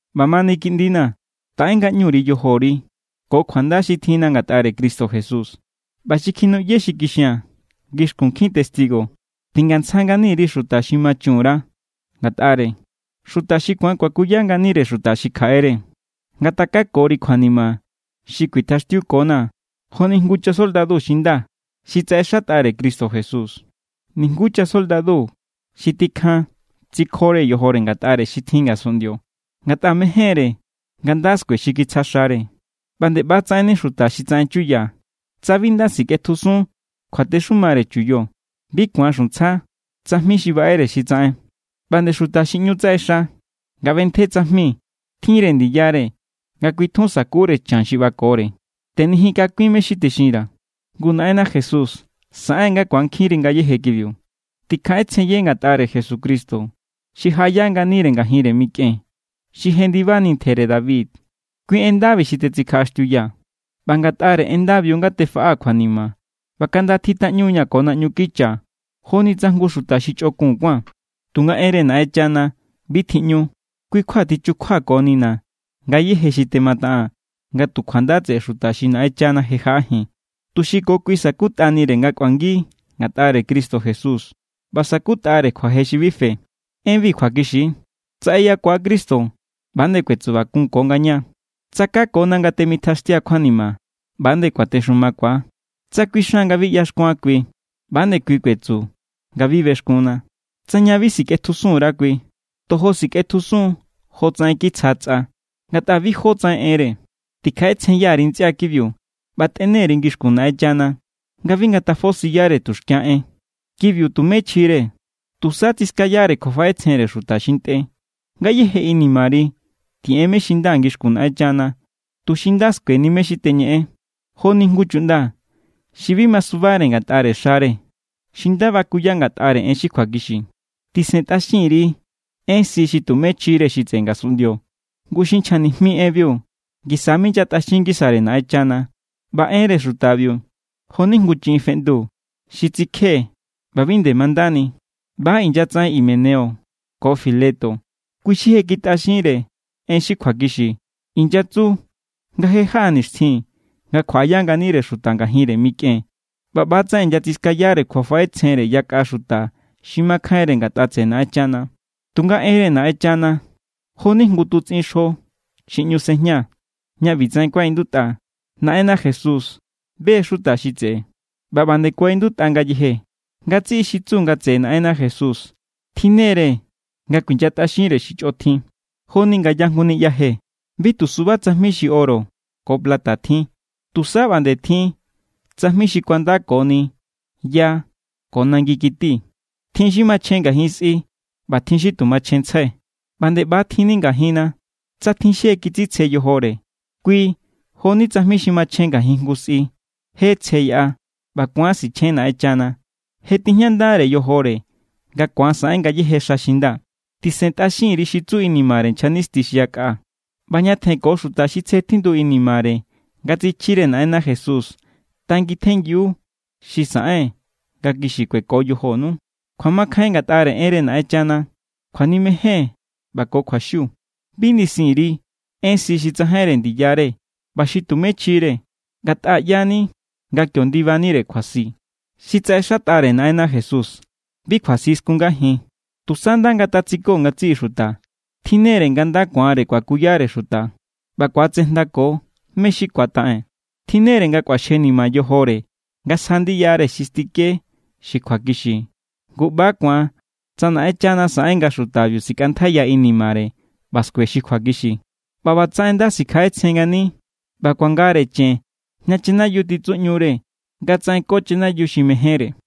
ꞌBamani kiꞌndina̱, taꞌe ngaꞌñu_ri yojori ko kjuanda xi tjinna ngatꞌare Cristo Jesús. ꞌBa xi kjinuꞌye xi kixia̱n ngixkun nkjin testigo, tingantsja ngani_ri xuta xi ma chun_ra ngatꞌare, xuta xi ku̱an kuakuya nganire xuta xi kjaꞌere. Ngatakakori kjuanima xi kuitjaxtiukonaa̱ joni jngu chasoldadu xi nda xi tsaꞌexatꞌare Cristo Jesús. Nijnguú chasoldadu xi tikjan tsikjore yojore ngatꞌare xi tjin ngasunꞌndio, ngatꞌa mején=re nga nda skue xi kitsja xare. ꞌBa nde ꞌbatsaꞌenni xuta xi tsaꞌen chuya, tsa bi nda sikꞌetjusun kjuatexumare chuyo, bi ku̱an xuntsja tsajmi xi baꞌere xi tsaꞌen. ꞌBa nde xuta xi ꞌñu tsaꞌexa nga ꞌbentje tsajmi tjin=re ndiyare nga kui tjun sa̱kure chan xi ꞌbakore. Tꞌejinkakuin mé= xi texinra̱, ngu Naꞌenna Jesús saꞌen nga ku̱ankjinri ngayéje kibiu. Tikjaꞌetsjenye ngatꞌare Jesucristo xi jaꞌaya nganire ngajinre mikꞌen, xi jendibani ntjere David. Kui en ndabi xi tetsikjaꞌaxtiuyaa̱. ꞌBa ngatꞌare en ndabiu nga tefaꞌaa̱ kjuanima ꞌba kaꞌnda tjitaꞌñaa̱ ko naꞌñu kicha joni tsa jngu xuta xi chꞌokun kuáa̱n. Tunga enre Naꞌenchana, bi tjiꞌñu. Kui= kjua tichukjuakonina̱ ngayéje xi temataꞌaa̱n nga tu kjuanda tseꞌe xuta xi Naꞌenchana je jaꞌajin, tuxi ko kui sa̱kutꞌanire nga kꞌuangi ngatꞌare Cristo Jesús ꞌba sa̱kutꞌare kjuaje xi bi fe. Enbi kjuakixi=: Tsa eyakua Cristo, ꞌba=nde kuetsubakunko ngaña. Tsa kakona nga temitjaxtia kjuanima, ꞌba=nde kuatexumakua. Tsa kuixan nga bi ꞌyaxkuan kui, ꞌba=nde kui kuetsu nga bi bexkunna. Tsa ña bi sikꞌetjusun_ra kui, tojo sikꞌetjusun= jotsaꞌen kitsja tsꞌa, ngatꞌa bi jó tsaꞌen enre. Tikjaꞌetsjenya_ri ntsꞌia kibiu ꞌba tꞌene_ri ngixkun Naꞌenchana nga bi ngatafosiyare tuxkia en. Kibiu tumé chjire, tusa tsiskayare kjuafaꞌetsjenre xuta xi ntꞌe. Ngayéje inimari tiꞌen mé= xi nda ngixkun Naꞌenchana, tuxi nda skueni mé= xi teñeꞌen, joni jngu chuꞌnda xi bi masubare ngatꞌare xare, xi nda bakuya ngatꞌare en xi kjuakixi. Tisentꞌaxin_ri en si xi tumé chjire xi tseꞌe ngasunꞌndio. Ngu xi nchja nijmi enbiu ngisa minyatꞌaxin ngisare Naꞌenchana. ꞌBa enre xutabiu jo=ni jngu chiꞌin feꞌndu xi tsikje ꞌba bi nde mandani. ꞌBa= inyatsaꞌen Himeneo ko Fileto. Kui xi je kitꞌaxinre en xi kjuakixi. Inyatsu nga je= jaꞌa nixtjin nga kjuaꞌaya nganire xuta ngajinre mikꞌen. ꞌBa ꞌbatsaꞌen inyatsiskayare kjuafaꞌetsjenre yakꞌa xuta xi makjainre ngatꞌa tseꞌe Naꞌenchana. Tunga enre Naꞌenchana jo=ni jngu tutsꞌin xjo xi ꞌñu sejña, ña ꞌbitsaꞌen kuaꞌindutꞌa: “Naꞌenna Jesús be= xuta xi tseꞌe.” ꞌBa ꞌba nde kuaꞌindutꞌa ngayeje: “Ngatsiꞌi xi tsu nga tseꞌe Naꞌenna Jesús tjinne=re nga kuinyatꞌaxinre xi chꞌotjin.” Joni ngaya jngu niꞌya je, bi tu suba tsajmi xi oro ko plata tjin. Tusa ꞌba nde tjin tsajmi xi kuandakoni ya ko nangikiti. Tjin xi machjen ngajin sꞌi ꞌba tjin xi tu machjenntsjai. ꞌBa nde ꞌba= tjinni ngajinna. Tsa tjin xi je kitsitsje yojore, kui jo=ni tsajmi xi machjen ngajin jngu sꞌi. Je tsje yaꞌa ꞌba ku̱an sichjen Naꞌenchana. Je tijñandare yojore nga ku̱an saꞌen ngayéje xa xi nda. Tisentꞌaxin_ri xi tsu inimare nchja nisti xi yakꞌa. ꞌBa ñatjen ko xuta xi tsje tjindu inimare nga tsichjire Naꞌenna Jesús tangitjenngiu xi saꞌen nga kixi kueko yojonu, kjuamakjain ngatꞌare enre Naꞌenchana, kjuanimejen ꞌba ko kjuaxiu. Bi nisin_ri en si xi tsajainre ndiyare ꞌba xi tumé chjire, ngatꞌa ꞌyani nga kio ndibanire kjuasi. Xi tsaꞌexatꞌare Naꞌenna Jesús bi kjuasi skungajin, tusa nda ngatatsiko ngatsiꞌi xuta. Tjinnere nga nda ku̱anre kuakuyare xuta ꞌba ku̱atsejndako mé= xi ku̱ataꞌen. Tjinnere nga kꞌuaxjenima yojore nga sja ndiyare xi stike xi kjuakixi. Ngu ꞌba ku̱an tsa Naꞌenchana saꞌen nga xutabiu sikꞌantjaiya inimare ꞌba skue xi kjuakixi ꞌba ꞌbatsaꞌen nda sikjaꞌetsjen ngani ꞌba ku̱angare chen ña chanayiu titsuꞌñure nga tsaꞌenko chanayiu xi mejénre.